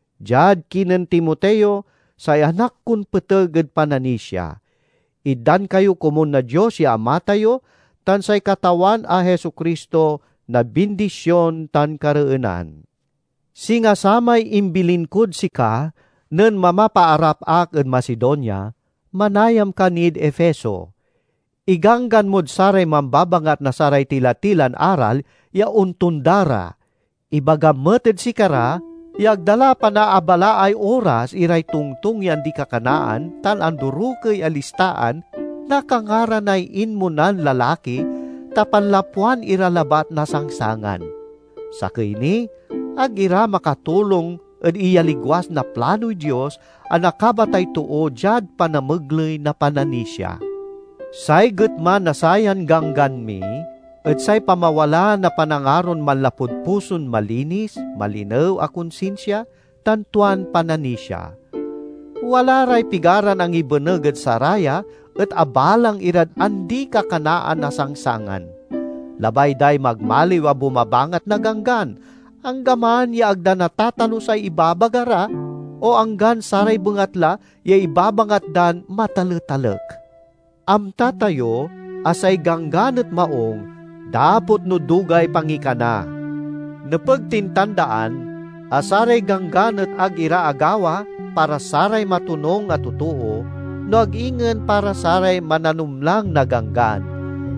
Diad kinen Timoteo, say anak kon peteg ed pananisia: Itdan kayo komun na Dios ya Ama tayo tan say Katawan a Jesu-Cristo na bindision tan kareenan. Singa samay imbilin kod sika nen mamapaarap ak ed Macedonia, manayam ka nid Efeso. Iganggan mod saray mambabangat na saray tila-tilan aral ya ontonda ra. Ibagam met ed sikara ya ag da la panaabalaay oras iray tongtong ya andi-kakanaan tan andorokey a listaan na kangaranay inmonan lalaki, ta panlapwan ira labat na sangsangan. Sakey ni, ag ira makatulong ed iyaligwas na planoy Dios, a nakabatay too diad panamegley na pananisia. Say getma na sayan ganggan mi et say pamawala na panangaron manlapud puson malinis, malinew a konsinsia, tan tuan pananisia. Wala ray pigaran angibeneg ed saraya et abalang irad andi-kakanaan a sangsangan. Labay day magmaliw a bumabangat na Ganggan, anggaman ya ag da natatalusay ibabaga ra o anggan saray bengatla ya ibabangat dan mataletalek. Amta tayo a say Ganggan et maung, dapot no dugay pangikana. Nepeg tin tandaan a saray ganggan et ag ira agawa para saray matonung a totoo, no ag ingen para saray mananumlang na ganggan,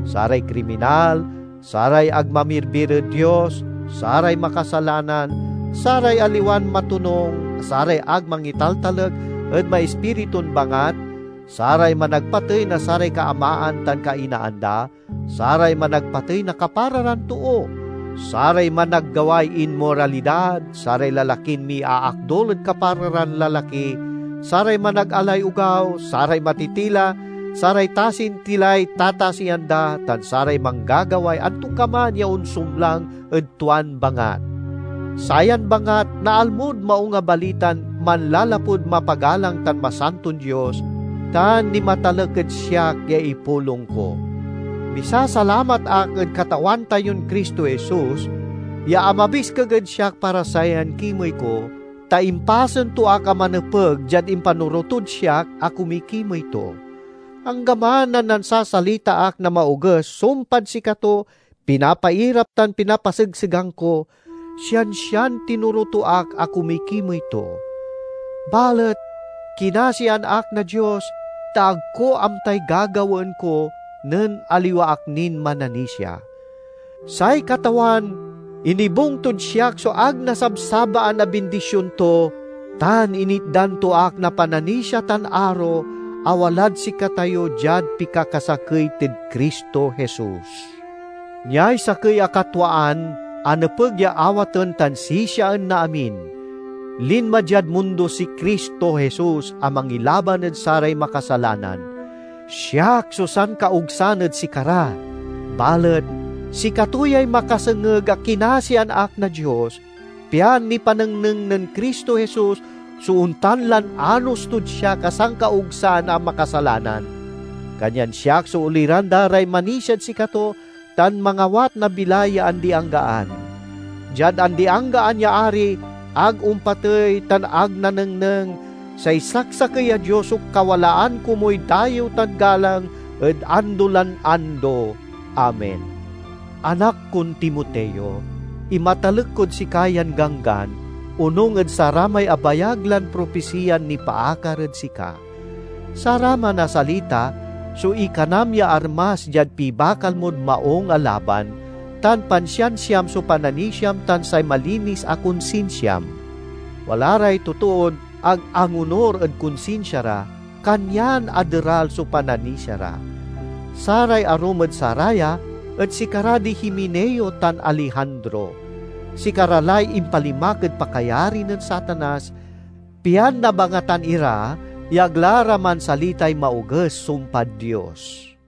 saray kriminal, saray ag mamirbir ed Dios, saray makasalanan, saray aliwan matonung, saray ag mangitaltalek ed maispiritun bangat, saray managpatey na saray kaamaan tan kainaan da, saray managpatey na kapara ran too, saray managgaway inmoralidad, saray lalakin miaakdul ed kapara ran lalaki, saray managalay ogaw, saray matitila, saray tasin tilay tatasian da tan saray manggagaway antokaman ya onsumlang ed tuan bangat. Sayan bangat naalmod Maung a Balitan manlalapud mapagalang tan masanton Dios, tan nimatalek ed siak ya ipulong ko. Misasalamat ak ed Katawan tayon Cristo Jesus, ya amabiskeg ed siak para sayan kimey ko, ta impasen to ak a manepeg diad impanoro tod siak a kumikimey to. Anggaman a nansasalita ak na maoges sumpad sikato, pinapairap tan pinapasegsegang ko, siansian tinoro to ak a kumikimey to. Balet kinasian ak na Dios, ta ag ko amtay gagawaen ko nen aliwa ak nin mananisia. Say Katawan inibung tod siak so ag nasabsabaan a bindision to tan initdan to ak na pananisia tan aro a walad sikatayo diad pikakasakey tid Cristo Jesus. Niay sakey a katwaan a nepeg ya awaten tan sisiaen na amin: linma diad mundo si Cristo Jesus a mangilaban ed saray makasalanan. Siak so sankaogsan ed sikara, balet sikato yay makasengeg a kinasian ak na Dios, pian nipanengneng nen Cristo Jesus so ontan lan anos tod siak a sankaogsan a makasalanan. Kanyan siak so oliran da ray manisiad sikato tan mangawat na bilay ya andi-anggaan. Diad andi-anggaan ya Ari, ag ompatey, tan ag nanengneng, say saksakey a Dios so kawalaan komuy dayew tan galang ed ando lan ando! Amen. Anak kon Timoteo, imatalek kod sika yan ganggan, onung ed saramay abayag lan propisiyan nipaakar ed sika. Saraman a salita so ikanam ya armas diad pibakal mod maung a laban, tan pansiansiam so pananisiam tan say malinis a konsinsiam. Wala ray totoon ag angonur ed konsinsia ra, kanyan aderal so pananisia ra. Saray arum ed saraya et sikara di Himeneo tan Alejandro; sikara lay impalimak ed pakayari nen Satanas, pian nabangatan ira ya ag la ra mansalitay maoges sumpad Dios.